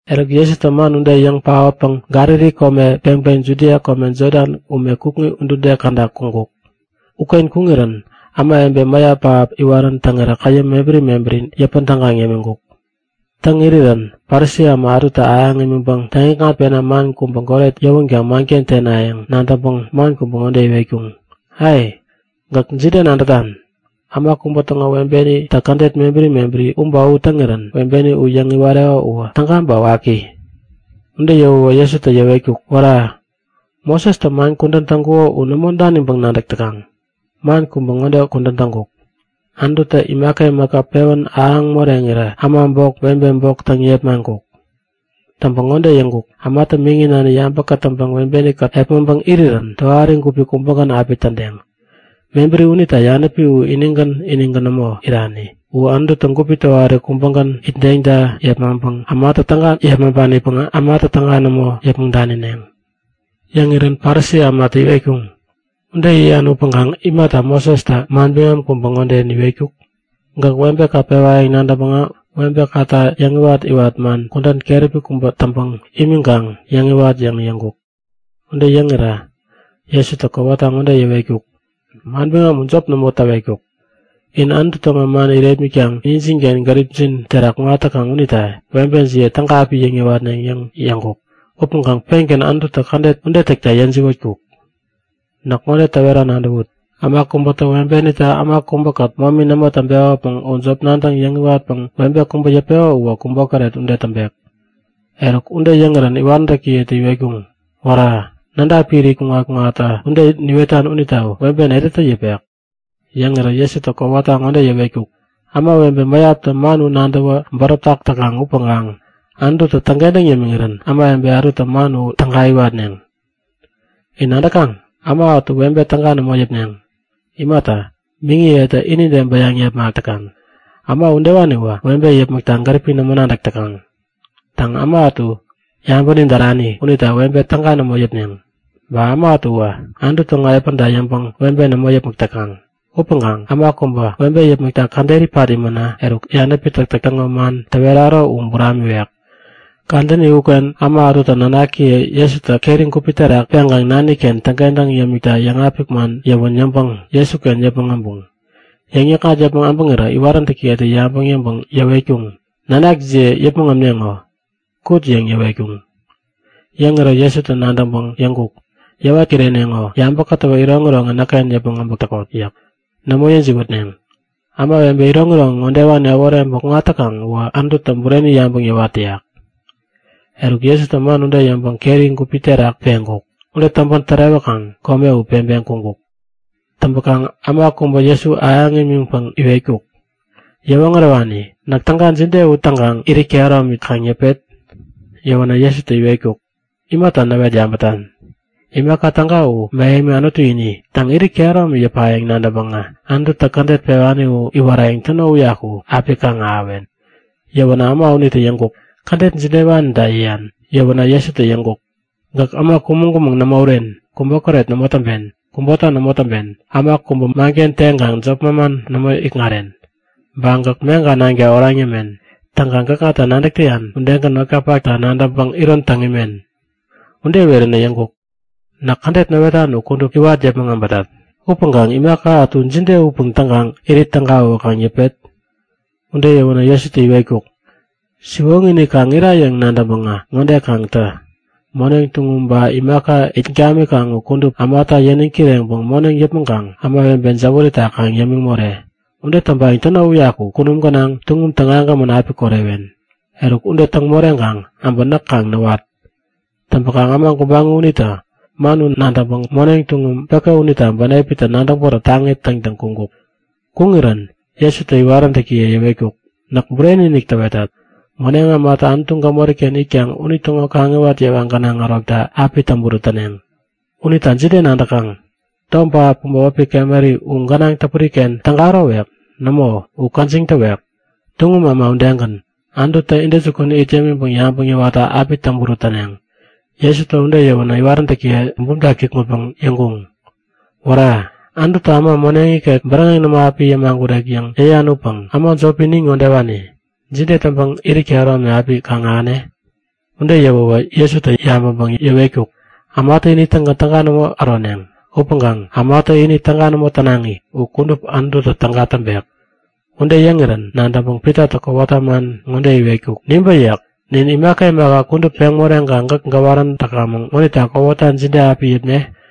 Eruk Jesutä man ude yäŋ paotpäŋ Galili kome peŋpeŋ Judia kome Jodan ume kukŋi udude käda kuŋkuk. Uken kuŋirän ämawebe mäyap pähap iwarän täŋirä käyäm mebäri mebäri yäpän tägaŋ yämiŋkuk. Täŋ irirän Parisi äma ätutä ahäŋ imiŋpäŋ täŋ-ikŋatpena man kubä goret yäwänkaŋ manken tenayäŋ nadäŋpäŋ man kubä ŋode iwetkuŋ; Ai! Gäk jide nadätan? Äma kubä täŋo webenitä kädet mebäri mebäri u ba u täŋirän webeni u yäŋ iwareko uwä täga ba waki? Ude yäwäwä Jesutä yäwetkuk; Wära! Mosestä man kudän täŋkuko u nämo daniŋpäŋ nadäk täkaŋ? Man kubä ŋode kudän täŋkuk; Anututä imaka imaka pewän ahäŋ moreŋirä äma bok, webe bok täŋ yepmaŋkuk. Täŋpäŋ ŋode yäŋkuk; Ämatä miŋi nani yabä kätäŋpäŋ webeni-kät epmäŋpäŋ irirän tohari gupi kubägän api tädeŋ. Mebäri unita yanäpi u inigän inigän nämo irani. U Anututä gupi tohari kubägän itdeŋta yepmaŋpanipäŋ ämatä täga nämo yäpmäŋ danineŋ. Yäŋirän Parisi ämatä iwetkuŋ; Ude yäyan upäŋkaŋ imata Mosestä manbiŋam kubä ŋode niwetkuk? Gäk webeka pewayäŋ nadäŋpäŋä webekata yäŋiwat-iwat man kudän keräpi kubä täŋpäŋ imiŋkaŋ kaŋ yäŋiwat yäŋ yäŋkuk. Ude yäŋirä Jesutä kowata ŋode yäwetkuk; Manbiŋam u jop nämo täwetkuk. In Anutu täŋo man irepmitkaŋ injinken gäripjin terak kuŋat täkaŋ unita webejiye täga api yäŋ-yäwatneŋ yäŋ yäŋkuk. Upäŋkaŋ pengän Anututä kädet ude täkta yäjiwätkuk. Näk ŋode täwera nadäwut; Äma kubätä webenitä äma kubäkät momi nämo täŋpekopäŋ jop nadäŋ yäŋiwatpäŋ webe kubä yäpeko uwä kubokäret ude täŋpek. Eruk ude yäŋirän iwaräntäkiyetä iwetkuŋ; Wära! Nädapi irit kuŋat-kuŋatta ude niwetan unita webe netätä yäpek? Yäŋirä Jesutä kowata ŋode yäwetkuk; Ämawebe mäyaptä man u nadäwä bäräp täkaŋ upäŋkaŋ Anututä täŋkentäŋ yämiŋirän ämawebe ätutä man u täga iwatneŋ. In nadäkaŋ? Äma ätu webe täga nämo yäpneŋ. Imata, miŋiyetä inide bäyaŋ yepmak täkaŋ. Äma udewaniwä webe yäpmäkta gäripi nämo nadäk täkaŋ. Täŋ, äma ätu yabäni därani unita webe täga nämo yäpneŋ. Ba äma ätuwä Anutu täŋo epänta yäŋpäŋ webe nämo yäpmäk täkaŋ. Upäŋkaŋ äma kubä, webe yäpmäkta käderi pat imänä, eruk yanäpi täktäk täŋo man täweraro u buramiwek. Kadäni uken ämawebe ätutä nanakiye Jesutä keri gupi terak peŋkaŋ nani-ken täŋkentäŋ yämikta yäŋapik man yäwän yäŋpäŋ Jesuken yäŋ yäpmäŋ äbuŋ. Yäŋ yäkŋat yäpmäŋ äbäŋirä iwaräntäkiyetä yabäŋ yäŋpäŋ yäwetkuŋ; Nanakjiye yäpmäŋ ämneŋo! Kut! yäŋ yäwetkuŋ. Yäŋirä Jesutä nadäŋpäŋ yäŋkuk; Yäwat kireneŋo! Yabä kätäwä iroŋiroŋi näkken yäpmäŋ äbäk täkot yäk. Nämo yäjiwätneŋ. Ämawebe iroŋiroŋi ŋodewani äworeŋpäŋ kuŋat täkaŋ uwä Anututä bureni yabäŋ yäwat täyak. Eruk Jesutä man ude yäŋpäŋ keri gupi terak peŋkuk. Ude täŋpän tärewäkaŋ kome u peŋpeŋ kuŋkuk. Täŋpäkaŋ äma kubä Jesu ahäŋ imiŋpäŋ iwetkuk; Yäwoŋärewani, näk täga jide u täŋkaŋ irit kehäromi kaŋ yäpet? Yäwänä Jesutä iwetkuk; Gäk imaka tägata imata näwet yabätan? Imaka täga u mähemi Anutu ini. Täŋ, irit kehäromi yäpayäŋ nadäŋpäŋä Anututä kädet pewani u iwarayäŋ täno uyaku api kaŋ-ahäwen. Yäwänä äma unitä yäŋkuk; Kädet jidewanita yäyan? Yäwänä Jesutä yäŋkuk; Gäk äma kumäŋ-kumäŋ nämo uren, kubokäret nämo täŋpen, kubota nämo täŋpen, äma kubä manken teŋkaŋ jop manman nämo ikŋaren. Ba gäk meŋka nanka oraŋ yämen. Täŋkaŋ gäkŋata nadäk täyan udegän notkapakta nadäŋpäŋ iron täŋ imen. Ude iweränä yäŋkuk; Näk kädet näwetan u kudup iwat yäpmäŋ äbätat. Upäŋkaŋ imaka ätu jide upäŋ täŋkaŋ irit tägawä kaŋ yäpet? Ude yäwänä Jesutä iwetkuk; Siwoŋi-inik kaŋ ira yäŋ nadäŋpäŋä ŋode kaŋ tä; Moneŋ tuŋum ba imaka it gamikaŋ u kudup ämata yäniŋ kireŋpäŋ moneŋ yäpmäŋkaŋ ämawebe jäwärita kaŋ yämiŋ more. Ude täŋpayäŋ täno uyaku kunum gänaŋ tuŋum tägagämän api korewen. Eruk, ude täŋ moreŋkaŋ äbä näk kaŋ näwat! Täŋpäkaŋ äma gubaŋi unitä man ude nadäŋpäŋ moneŋ tuŋum päke unita bänepitä nadäŋ bäräp taŋi täŋtäŋ kuŋkuk. Kuŋirän Jesutä iwaräntäkiye yäwetkuk; Näk bureni-inik täwetat; Moneŋ ämatä Anutu gämori-ken itkaŋ unitäŋo kaŋiwat yewa gänaŋ ärokta api täŋburut täneŋ. Unita jide nadäkaŋ? Tom pähap kubä wäpi kameri u gänaŋ täpuri-ken täga ärowek? Nämo, u käjiŋ täwek. Tuŋum äma udegän, Anututä intäjukun it yämiŋpäŋ yabäŋ yäwatta api täŋburut täneŋ. Jesutä ude yäwänä iwaräntäkiyetä bumta kikŋutpäŋ yäŋkuŋ; Wära! Anututä äma moneŋ ikek bäräŋeŋ nämo api yämagurek yäŋ yäyan upäŋ äma jopi nin ŋodewani jide täŋpäŋ irit kehäromi api kaŋ-ahäne? Ude yäwäwä Jesutä yabäŋpäŋ yäwetkuk; Ämatä ini-tägän täga nämo äroneŋ. Upäŋkaŋ ämatä ini täga nämo tänaŋi u kudup Anututä täga täŋpek. Ude yäŋirän nadäŋpäŋ Pitatä kowata man ŋode iwetkuk; Nibä yäk. Nin imaka imaka kudup peŋ moreŋkaŋ gäk gäwarän täkamäŋ ŋonita kowata jide api yäpne?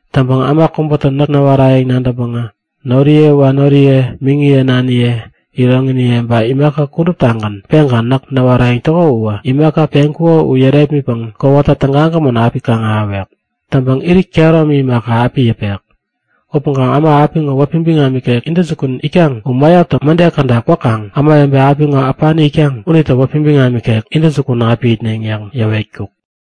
Täŋpäŋ äma kubätä näk näwarayäŋ nadäŋpäŋ noriye wanoriye, miŋiye naniye, iroŋiniye ba imaka kuduptagän peŋkaŋ näk näwarayäŋ täko uwä imaka peŋkuko u yärepmitpäŋ kowata tägagämän api kaŋ-ahäwek. Täŋpäŋ irit kehäromi imaka, api yäpek. Upäŋkaŋ äma apiŋo wäpi biŋam ikek intäjukun itkaŋ u mäyaptä mäde käda kwäkaŋ ämawebe apiŋo äpani itkaŋ unitä wäpi biŋam ikek intäjukun api itneŋ yäŋ yäwetkuk.